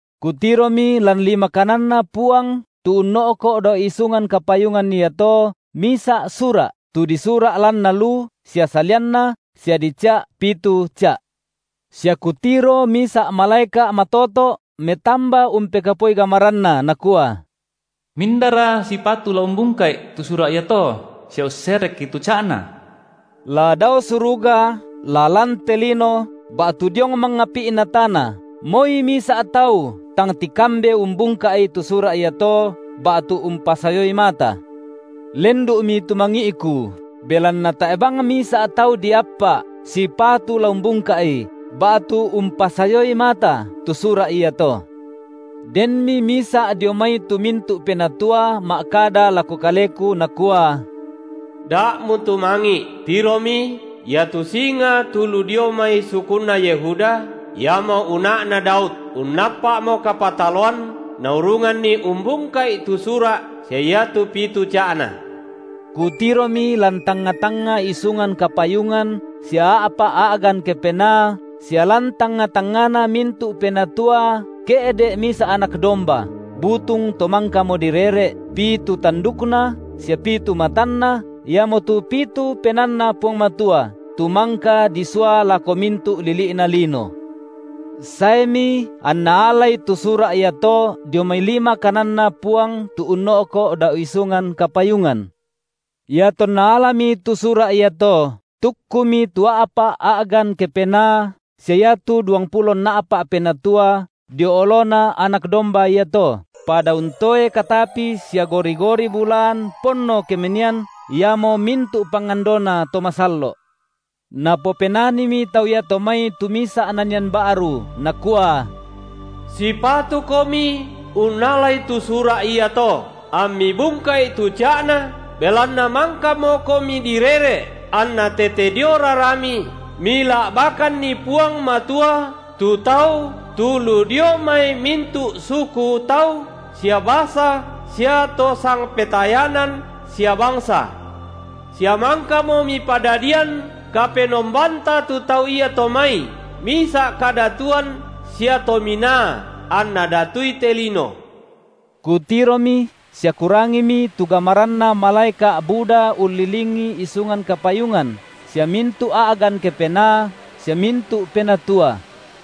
Kutiromi lan lima kananNa Puang tu unno’ko’ dao isungan kapayungan iato misa’ sura’, tu disura’ lanna lu sia salianna, sia dica’ pitu ca’. Sia kutiro misa’ malaeka’ matoto’ metamba umpekapuai gamaranna, nakua: Mindara sipatu la umbungka’i tu sura’ iato sia usserekki tu ca’na? La dao suruga, la lan te lino, ba’tu diong mangapi’na tana, moi misa’ tau tang tikambe umbungka’i tu sura’ iato ba’tu umpasayoi mata. Lendu’mi tumangi’ku, belanna tae’ bang misa’ tau diappa’ sipatu la umbungka’i ba’tu umpasayoi mata tu sura’ iato. Denmi misa’ dio mai tu mintu’ penatua ma’kada lako kaleku nakua: Da mutumangi’, tiromi, iatu Singa tu lu dio mai sukunna Yehuda, iamo Una’na Daud unnappa’mo kapataloan naurunganni umbungka’i tu sura’ sia iatu pitu ca’na. Kutiromi lan tangnga-tangnga isungan kapayungan sia a’pa’ a’gan kepenaa sia lan tangnga-tangngana mintu’ penatua ke’de’ misa’ Anak domba, butung to mangkamo direre’, pitu tandukna, sia pitu matanna, iamotu pitu PenaanNa Puang Matua, tu mangka disua lako mintu’ lili’na’ lino. Saemi anna alai tu sura’ iato dio mai lima kananNa Puang tu unno’ko’ dao isungan kapayungan. Iatonna alami tu sura’ iato, tukkumi tu a’pa’ a’gan kepenaa sia iatu duangpulo nna’pa’ penatua dio oloNa Anak domba iato, pada untoe katapi sia gori-gori bulaan ponno kemenian, iamo mintu’ pangandona to masallo’. Napopenanimi tau iato mai tu misa’ nanian ba’ru, nakua: Sipatukomi unnalai tu sura’ iato, amMi bungka’i tu ca’na, belanna mangkamoKomi direre’, anna tete dio raraMi Mila’bakanNi Puang Matua tu tau tu lu dio mai mintu’ suku tau sia basa sia to sangpetayanan sia bangsa. Sia mangkamo Mipadadian Kapenombanta tu tau iato mai misa’ kadatuan sia tominaa, anna datui te lino. Kutiromi sia kurangimi tu gamaranna malaeka’ buda ullilingi isungan kapayungan sia mintu’ a’gan kepenaa sia mintu’ penatua;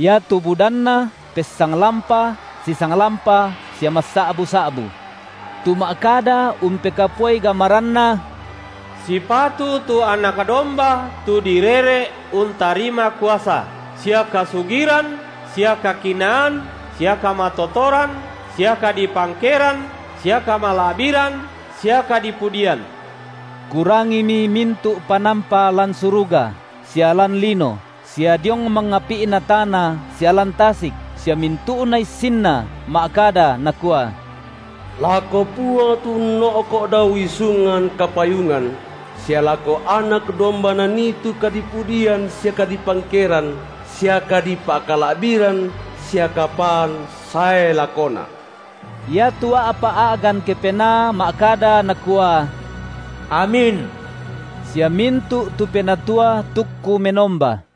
iatu budanna pessanglampa sisanglampa sia massa’bu-sa’bu, tu ma’kada umpekapuai gamaranna: Sipatu tu Anak domba tu direre’ untarima kuasa sia kasugiran sia kakinaan sia kamatotoran sia kadipangkeran sia kamala’biran sia kadipudian. Kurangimi mintu’ panampa lan suruga, sia lan lino, sia diong mangapi’na tana sia lan tasik, sia mintu’na issinna ma’kada, nakua: Lako Puang tu unno’ko’ dao isungan kapayungan sia lako Anak domba nanii tu kadipudian sia kadipangkeran sia kadipakala’biran sia kapaan sae lakona. Iatu a’pa’ a’gan kepenaa ma’kada, nakua: Amin. Sia mintu’ tu penatua tukku menomba.